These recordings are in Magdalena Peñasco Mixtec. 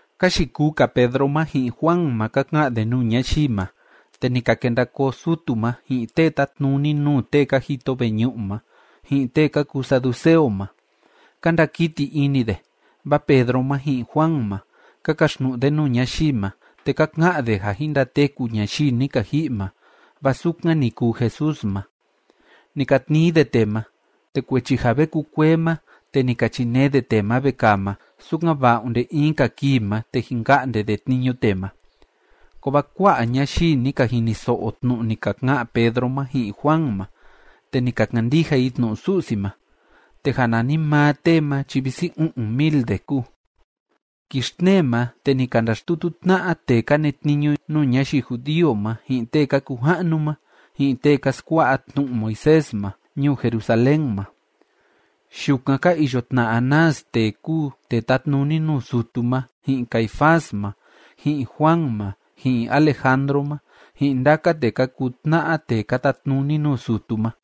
Ka yikuu‑ka Pedro ma ji'in Juan ma ka ka'an de nuu ñayii ma, te ni ka kenda koo sutu ma, ji'in tee tátnuni nuu tee ka jito veñu'u ma, ji'in tee ka kuu saduceo ma. Ka ndakiti ini de, vaa Pedro ma ji'in Juan ma, ka kaxtnu'u de nuu ñayii ma, te ka ka'an de ja jin ndateku ñayii ni ka ji'i ma, vaa sukan ni kuu Jesús ma. Ni ka tnii de tee ma. Te kuechi ja ve kukuee ma, te ni ka chinee de tee ma vekaa ma, sukan‑va'a onde in‑ka kii ma, te jin ka'nde de tniñu tee ma. Kovaa kua'a ñayii ni ka jiniso'o tnu'u ni ka ka'an Pedro ma ji'in Juan ma, te ni ka kandija i tnu'u Su'si ma, te ja nanimaa tee ma chi visi u'un mil de kúu. Kii xtnee ma, te ni ka ndaxtutu tna'a tee ka netniñu nuu ñayii judío ma, ji'in tee ka kuu ja'nu ma, ji'in tee ka skua'a tnu'u Moisés ma, ñuu Jerusalén ma. Yukan ka iyo tna Anás tee kúu tee tátnuni nuu sutu ma, ji'in Caifás ma, ji'in Juan ma, ji'in Alejandro ma, ji'in ndaka tee ka kuu tna'a tee ka tatnuni nuu sutu ma.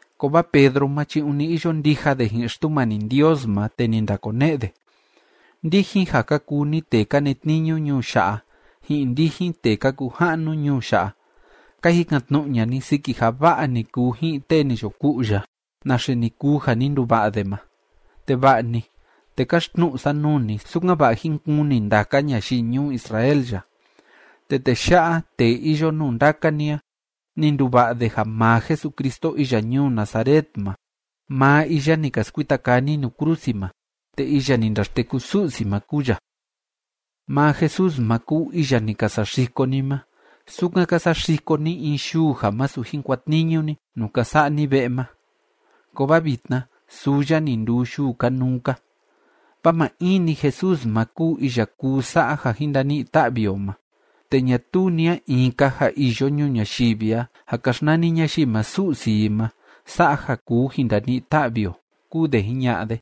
Kovaa Pedro ma chi ûni iyo ndija de ji'in Xtumani Ndios ma, te ni ndakone'e de: ―Ndijin, ja ka kuu ni tee ka netniñu ñuu ya'a ji'in ndijin tee ka kuu ja'nu ñuu ya'a, ka jikan‑tnu'u ña'a ni siki ja va'a ni kuu ji'in tee ni yo ku'u ya, naxe ni kuu ja ni nduva'a de ma. Te va'a‑ni, te káxtnu'u sa nuu ni, sukan‑va'a jín kuni ndaka ñayii ñuu Israel ya. Te tee ya'a tee iyo nuu ndaka ni a, ni nduva'a de ja maa Jesucristo iya ñuu Nazaret ma maa iya ni ka skuita kaa ni nuu krusi ma. Te iya ni ndaxteku Su'si ma kúu ya. Maa Jesús ma kúu iya ni ka saxiko ni ma, sukan ka saxiko ni in yuu ja masu jin kuatniñu ni nuu ka sa'a ni ve'e ma. Kovaa vitna suu ya ni nduu yuu kanuu‑ka. Vaa maa in‑ni Jesús ma kúu iya kuu sa'a ja jin ndani'i ta'vi o ma, te ñatuu ni a in‑ka ja iyo ñuu ñayivi a ja ka xnani ñayii ma su'si i ma sa'a ja kuu jin ndani'i ta'vi o ―kúu de jiña'a de.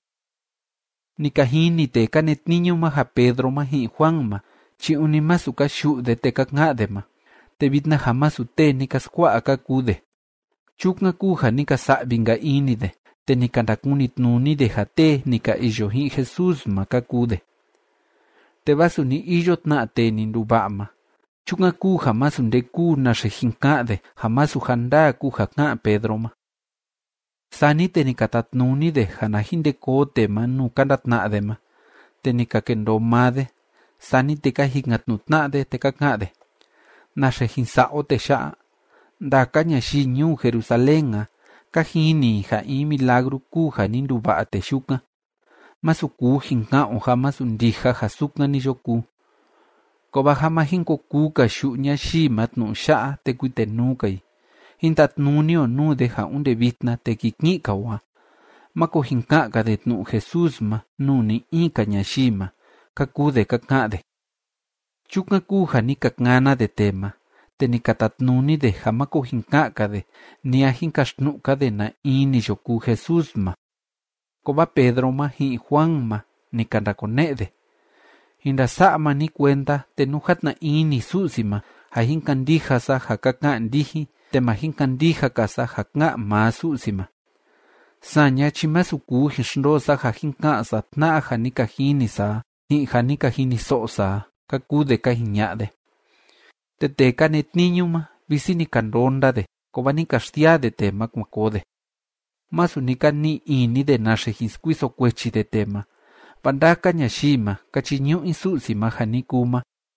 Ni ka jini tee ka netniñu ma ja Pedro ma ji'in Juan ma chi ûni masu ka yu'u de te ka ka'an de ma, te vitna ja masu tee ni ka skua'a ka kuu de. Chukan kúu ja ni ka sa'vi‑nka ini de, te ni ka ndakunitnuni de ja tee ni ka iyo ji'in Jesús ma ka kuu de. Te vaa suni iyo tna tee ni nduva'a ma. Chukan kúu ja masu nde kúu naxe jin ka'an de ja masu ja ndaa kúu ja ká'an Pedro ma. Sani te ni ka tatnuni de ja na jin nde koo tee ma nuu ka ndatna'a de ma, te ni ka kendoo maa de. Sani te ka jikan‑tnu'u tna'a de, te ka ka'an de: ―¿Naxe jin sa'a o tee ya'a? Ndaka ñayii ñuu Jerusalén a, ka jini i ja in milagru kúu ja ni nduva'a tee yukan. Masu kuu jin ka'an o ja masu ndija ja sukan ni yo kuu. Kovaa ja ma jin ko kuu‑ka yu'u ñayii ma tnu'u ya'a te kuitenuu‑ka i, jín tatnuni o nuu de ja onde vitna te kii ki'in‑ka o a, máko jin ka'an‑ka de tnu'u Jesús ma nuu ni‑in‑ka ñayii ma ―ka kuu de ka ka'an de. Chukan kúu ja ni ka kana de tee ma, te ni ka tatnuni de ja máko jin ka'an‑ka de ni a jin kaxtnu'u‑ka de na in ni yo kuu Jesús ma. Kovaa Pedro ma ji'in Juan ma, ni ka ndakone'e de: ―Jin ndasa'a maa ni kuenda, te nú játna ini Su'si ma ja jin kandija sa ja ka ka'an ndijin, te ma jin kandija‑ka sa ja ká'an maa Su'si ma. Saña chi masu kuu jin xndoo sa ja jin ka'an sa tna'a ja ni ka jini sa a ji'in ja ni ka jiniso'o sa a ―ka kuu de ka jiña'a de. Te tee ka netniñu ma, visi ni ka ndonda de, kovaa ni ka xsiaa de tee ma kuan koo de. Masu ni ka ni'i ini de naxe jin skuiso kuechi de tee ma, vaa ndaka ñayii ma, ka chiñu'u i Su'si ma ja ni kuu ma.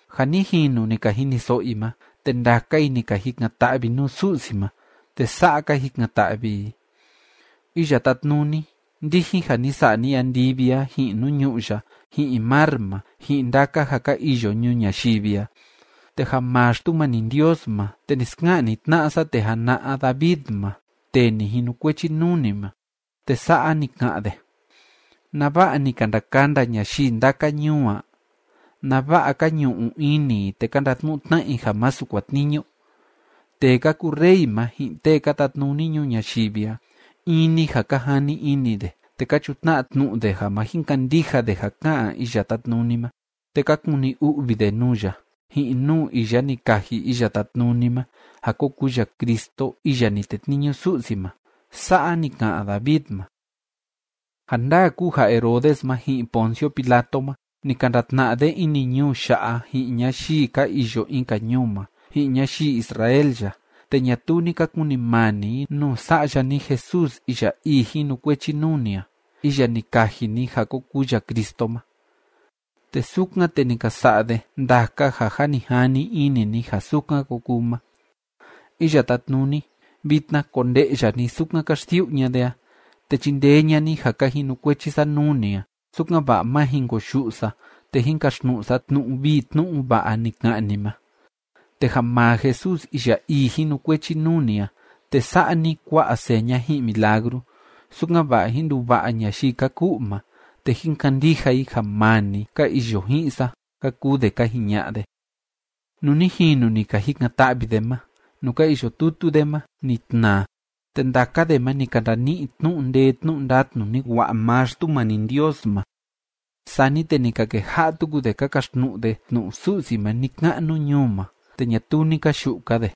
Ja ni jinu ni ka jiniso'o i ma, te ndaka i ni ka jikan‑ta'vi nuu Su'si ma, te sa'a ka jikan‑ta'vi i: ―Iya Tátnuni, ndijin ja ni sa'a ni andivi a, ji'in nuu ñu'ú ya, ji'in mar ma, ji'in ndaka ja ka iyo ñuu ñayivi a, te ja maa Xtumani Ndios ma, te ni ska'an ni tna'a sa tee jana'a David ma, tee ni jinukuechi nuu ni ma, te sa'a ni ka'an de: ¿Nava'a ni ka ndakanda ñayii ndaka ñuu a? ¿Nava'a ka ñu'u ini i te ka ndatnu'u tna'a i ja masu kuatniñu? Tee ka kuu rey ma, ji'in tee ka tatnuni ñuu ñayivi a, in‑ni ja ka jani ini de, te ka chutna'a tnu'u de ja ma jin kandija de ja ká'an Iya Tátnuni ma, te ka kuni u'vi de nuu ya, ji'in nuu iya ni kaji Iya Tátnuni ma ja ko kuu ya Cristo iya ni tetniñu Su'si ma. Sa'a ni ka'an David ma. ’Ja ndaa kúu ja Herodes ma ji'in Poncio Pilato ma, ni ka ndatna'a de ini ñuu ya'a ji'in ñayii ka iyo in‑ka ñuu ma, ji'in ñayii Israel ya, te ñatuu ni ka kunimani i nuu Sa'ya ni Jesús iya ii jinukuechi nuu ni a, iya ni kaji ni ja ko kuu ya Cristo ma. Te sukan, te ni ka sa'a de ndaka ja jâ ni jani ini ni ja sukan ko kuu ma. Iya Tátnuni, vitna konde'ya ni sukan ka xsiu'u ña'a de a, te chindee ña'a ni ja ka jinukuechi sa nuu ni a, sukan‑va'a má jin koyu'u sa te jín kaxtnu'u sa tnu'u vii tnu'u va'a ni ka'an ni ma. Te ja maa Jesús iya ii jinukuechi nuu ni a, te sa'a ni kua'a seña ji'in milagru, sukan‑va'a jín nduva'a ñayii ka ku'u ma te jín kandija i ja maa ni ka iyo ji'in sa ―ka kuu de ka jiña'a de. Nuu ni jinu ni ka jikan‑ta'vi de ma, nuu ka iyo tutu de ma ni tnaa, te ndaka de ma ni ka ndani'i tnu'u ndee tnu'u ndatnu ni wa'a maa Xtumani Ndios ma. Sani te ni ka keja'a tuku de ka kaxtnu'u de tnu'u Su'si ma ni‑ka'nu ñuu ma, te ñatuu ni ka yu'u‑ka de.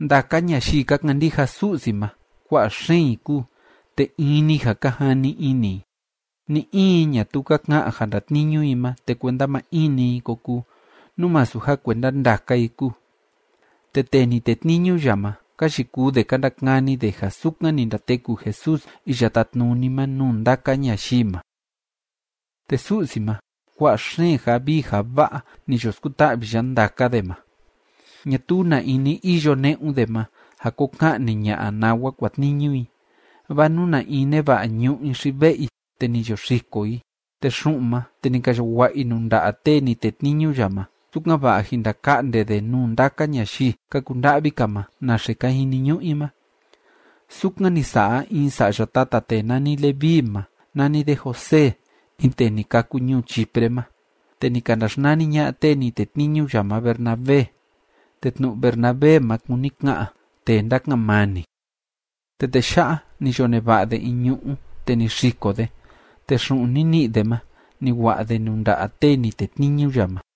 Ndaka ñayii ka kandija Su'si ma, kua'a xeen i kúu, te in‑ni ja ka jani ini i. Ni‑in i ñatuu ka ka'an ja ndatniñu i ma te kuenda ma in‑ni i ko kuu, nú masu ja kuenda ndaka i kúu. Te tee ni tetniñu ya ma, ka yikuu de ka ndakani de ja sukan ni ndateku Jesús iya tátnuni ma nuu ndaka ñayii ma. Te Su'si ma, kua'a xeen ja vii ja va'a ni yo skuta'vi ya ndaka de ma. Ñatuu na in ni iyo ne'un de ma ja ko ka'ni ña'a nawa kuatniñu i, vaa nú na in neva'a ñu'ú i xi ve'e i, te ni yo xiko i, te xu'un ma, te ni ka yo wa'a i nuu nda'a tee ni tetniñu ya ma, sukan‑va'a jin ndaka'nde de nuu ndaka ñayii ka kunda'vi‑ka ma naxe ka jiniñu'u i ma. Sukan ni sa'a in sa'ya tata tee nani Leví ma nani de José in tee ni kâku ñuu Chipre ma, te ni ka ndaxnani ña'a tee ni tetniñu ya ma Bernabé. Te tnu'u Bernabé ma kúni ka'an “Tee Ndáka'an Mani”. Te tee ya'a, ni yo neva'a de in ñu'ú, te ni xiko de, te xu'un ni ni'i de ma ni wa'a de nuu nda'a tee ni tetniñu ya ma.